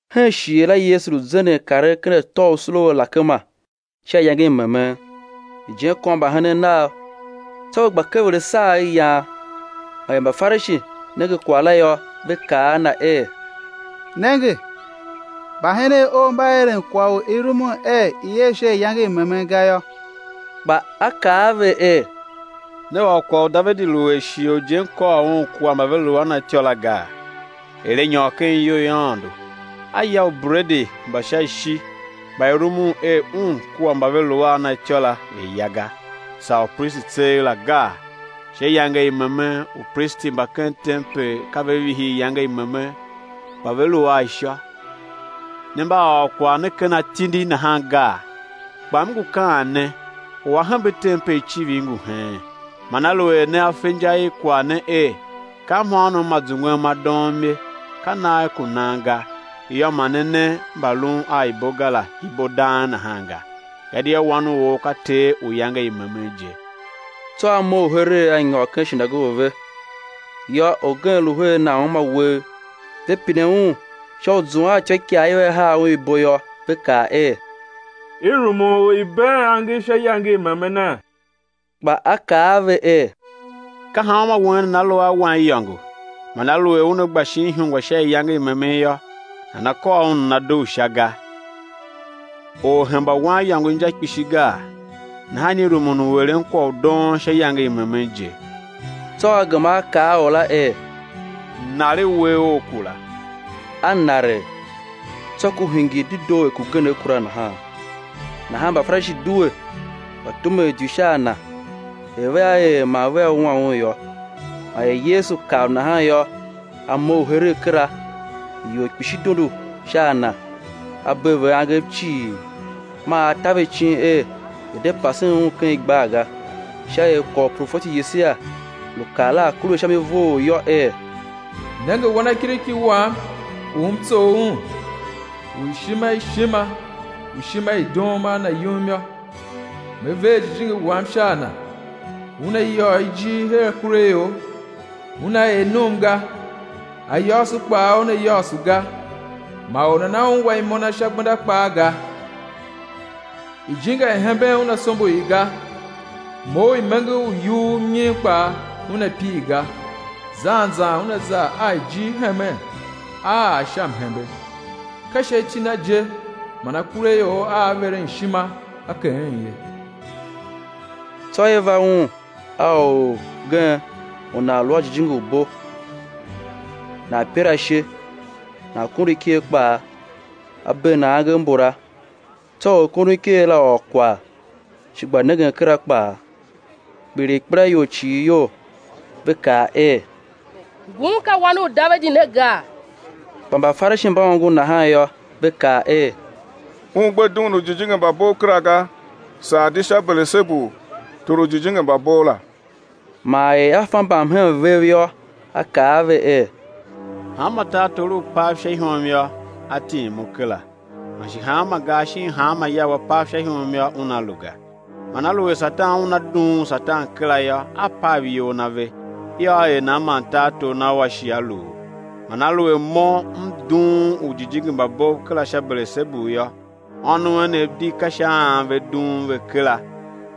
Hen shighe la Yesu lu zenden karen ker atô u sule u alakema sha iyange i memen; ijen kôr mbahenen Nav; tsô ve gba kever asagher, yan. Man er Mbafarishi nenge kwagh la yô, ve kaa a Na er: Nenge, mbahenen Ou mba eren kwagh u i rumun er i̱ er sha iyange i memen ga yô. Kpa A kaa a ve er: Ne ôr kwagh u Davidi lu er shighe u ijen kôr un kua mba ve lu a na imôngo la gaa, er a nyôr ken iyou i Aôndo, a ya ubredi mba sha ishi mba i rumun er un kua mba ve lu a na ityô la ve̱ ya ga, saa upristi tseegh la gaa? Sha iyange i memen upristi mba ken tempel ka ve vihi iyange i memen, kpa ve lu a ishô, ne mba a ôr kwagh ne ken atindi nahan gaa? Kpa M ngu kaan ne, u A hembe tempel icivir ngu heen. Man aluer nea fe inja i kwagh ne er: Ka mhôônom ma zungwen ma doom ye, ka nagh ku nan ga, yô, ma ne ne mbalun a ibo ga la ibo dang nahan ga; gadia Wan u or ka Ter u iyange i memen je. Tsô A mough heregh A nyôr ken shinagoge ve. Yô, orgen lu her nan uma uwegh; ve pine Un sha u zuan a ityôikaa i vea haa Un ibo yô, ve kaa er: I rumun u i̱ been angev sha iyange i memene? Kpa A kaa a ve er: Ka hanmô wen nana lu a waniyôngo, man aluer una gba shin ihungwa sha iyange i memen yô, nana kôr un, nana dugh sha ga? Or hemba waniyôngo inja kpishi gaa? Nahan i rumun u eren kwagh u doon sha iyange i memen je. Tsô A gema A kaa a or la er: Naregh uwegh ough kura. A naregh; tsô ku hingir dedoo er kugenegh kura nahan. Nahan Mbafarishi due, gba tumen idyu sha a Na, er vea er man vea wua Un yô. Man er Yesu kav nahan yô, A mough heregh kera; ior kpishi dondo sha a Na; A bee ve angev cii; man A ta ve icin er, ve̱ de pasen Un ken igbar ga; sha er kwagh u profeti Yesaia lu kaa la a̱ kure sha mi vough yô, er: Nenge Wanakiriki Wam u M tsough Un, u ishima ishima, u ishima i doom a Na yum yô, Me ver Jijingi Wam sha a Na, Una yôô ijir her akuraior. Una er num ga, ayôôso kpaa Una yôôso ga; ma or nana ungwa imo Na sha gbenda kpaa ga. Ijinga i hemben Una sombo i ga; mou u imenger u yughur mnyim kpaa, Una pir ga, zan zan Una za a ijir hemen, á ar sha mhembe. Ka sha iti Na je man akuraior aa veren ishima á keghen ye. Tsô i va Un a orgen u nan lu a jijingi u bo, nan pir ashe, nan kondo iker kpaa. A bee nan angev mbula; tsô orkondoniker la ôr kwagh, shi gba nengen kera kpaa. Kpiligh ikpelaior cii iyol, ve kaa er: Ngun ka Wan u Davidi ne gaa? Kpa Mbafarishi mba ongo nahan yô, ve kaa er: Un gbe dughun ujijingi mba bov kera ga, saa di sha Belesebu, tor u ujijingi mba bov la. Man er A fa mbamhen vev yô, A kaa a ve er: Hanma tartor u u pav sha ihom yô, á tim u kera. Man shi hanma gar shin hanma ya u a pav sha ihom yô, una lu ga. Man aluer Satan una dughun Satan kera yô, a pav iyol na ve; yô, á er nan man tartor na ua shi á luu? Man aluer Mo M dughun ujijingi mba bov kera sha Belesebu yô, ônov enev di ka sha an ve dughun ve kera?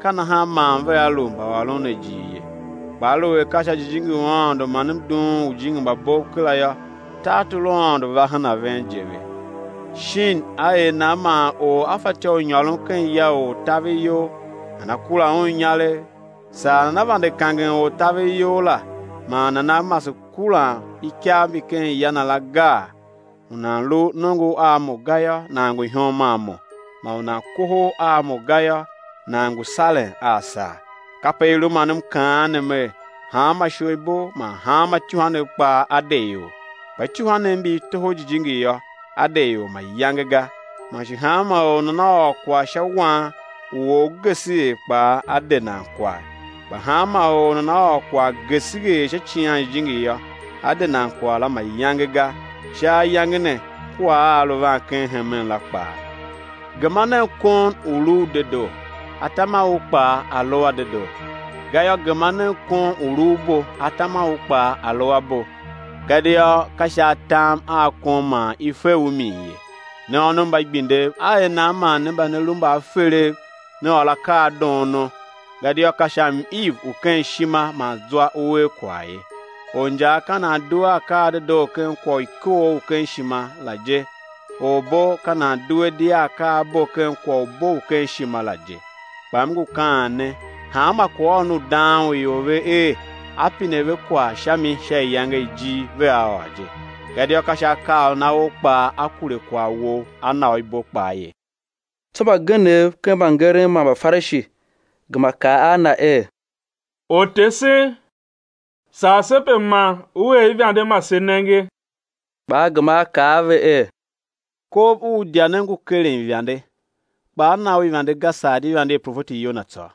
Ka nahan man vea lu mbaôron ne ijir ye. Kpa aluer ka sha Jijingi u Aôndo man M dughun ujijingi mba bov kera yô, tartor u Aôndo va hen a ven je ve. Shin á er nan man or á fatyô u nyôron ken ya u ortaveryol, nana kura un inyaregh, saa nana vande kangen ortaveryol la, man nana mase kuran ikav mbi ken ya na la, gaa? U nan lu nongo a Mo ga yô, nan ngu ihom a Mo, man u nan kohol a Mo ga yô, nan ngu saren a sar. Kape i lu man M kaan ne Mer: Hanma isholibo man hanma ityuhwanev kpaa á de ior; kpa ityuhwanev mbi i toho Jijingi yô,á de ior mayange ga. Man shi hanma or u nana ôr kwagh sha Wan u or geseghee kpaa á de nan kwagh la; kpa hanma or u nana ôr kwagh geseghee sha Icighan Jijingi yô, á de nan kwagh la mayange ga, sha ayange ne kua a a lu van ken hemen la kpaa. Gema nen kon u̱ lu u dedoo, atam a u kpaa a̱ lu a dedoo; gayô, gema nen kon u̱ lu u bo, atam a u kpaa a̱ lu a bo; gadia ka sha atam a kon man i fe u min ye. Ne ônov mba igbindev, á er nan man ne mba ne lu mbaaferev, né ôr akaa a doono? Gadia ka sha m-iv u ken ishima man zwa u er kwagh ye. Orinjaa ka nan due a akaa a dedoo ken kwagh u ikoogh u ken ishima la je; orbo ka nan due di a akaabo ken kwagh u bo u ken ishima la je. Kpa M ngu kaan ne: Hanma kwaghôron u dang u ior ve er, á pine ve kwagh sha mi sha iyange i ijir, vea ôr je. Gadia ka sha akaaôron a ou kpaa á kure kwagh wou á na u ibo kpaa ye. Tsô mbagenev ken mbangeren man Mbafarishi gema kaa a Na er: Ortesen, sar se pe ma U er ivande ma se nenge. Kpa A gema A kaa a ve er: Kov u idya ne ngu keren ivande, kpa á na u ivande ga, saa di ivande i profeti Yona tsô.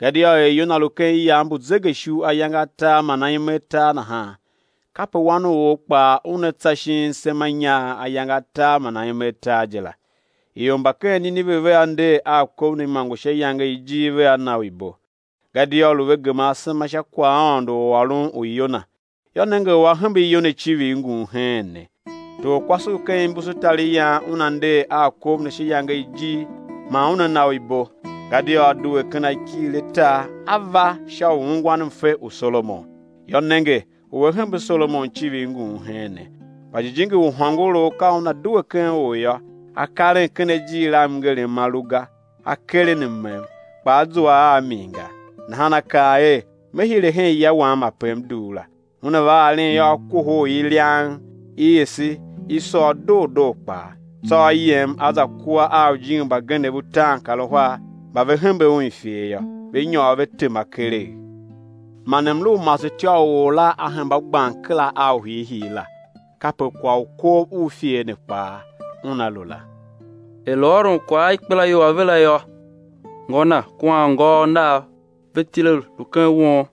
Gadia er Yona lu ken iyav mbu zegeishu ayange atar man aime atar nahan, kape Wan u or kpaa Una tsa shin semanyaagh ayange atar man aime atar je la. Ior mba ken Nineve vea nder a kov ne imôngo sha iyange i ijir, vea na u ibo; gadia lu ve gema asema sha kwaghaôndo u ôron u Yona; yô, nenge, u A hembe Yona icivir Ngun heen ne. Torkwase u ken imbusutariyan una nder a kov ne sha iyange i ijir, man una na u ibo; gadia a due ken akighir a tar, a va sha u ungwan mfe u Solomon. Yô, nenge, u A hembe Solomon icivir Ngun heen ne. Kpa jijingi u hôngorough ka una due ken or yô, a karen ken ajir a mngerem ma lu ga, a keren mmem, kpa a zua a min ga. Nahan a kaan er: Me hire hen ya wam ape m dugh la. Una va aren yô, a kohol i liang, i ese, i sôr doo doo kpaa. Tsô a yem a za kua a ujijingi mbagenev utaankaruhar mba ve hembe un ifer yô, ve nyôr ve tema keregh; man mlu u masetyô u or la a hemba gban kera a u hiihii la. Kape kwagh u kov u ifer ne kpaa una lu la. Er lu ôron kwagh a ikpelaior ave la yô, ngô na kua anngôôv Nav ve tile lu ken won,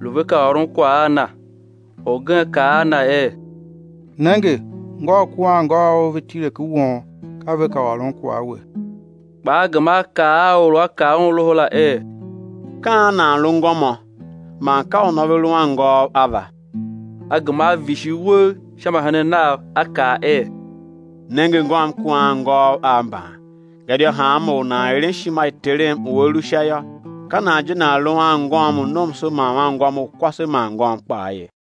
lu ve ka ôron kwagh a Na. Orgen kaa a Na er: Nenge, ngôu kua anngôôv Ou ve tile ken won, ka ve ka ôron kwagh a We. Kpa A gema A kaa a or u a kaa Un loho la er: Ka an nan lu ngômô? Man ka unô ve lu anngôôv ava? A gema A vishigh uwegh sha mbahenen Nav, A kaa er: Nenge ngôm kua anngôôv Av mban. Gadia hanma or u nan eren ishima i Terem u A lu Sha yô, ka nan je nan lu anngôm u nomso man anngôm u kwase man ngôm kpaa ye.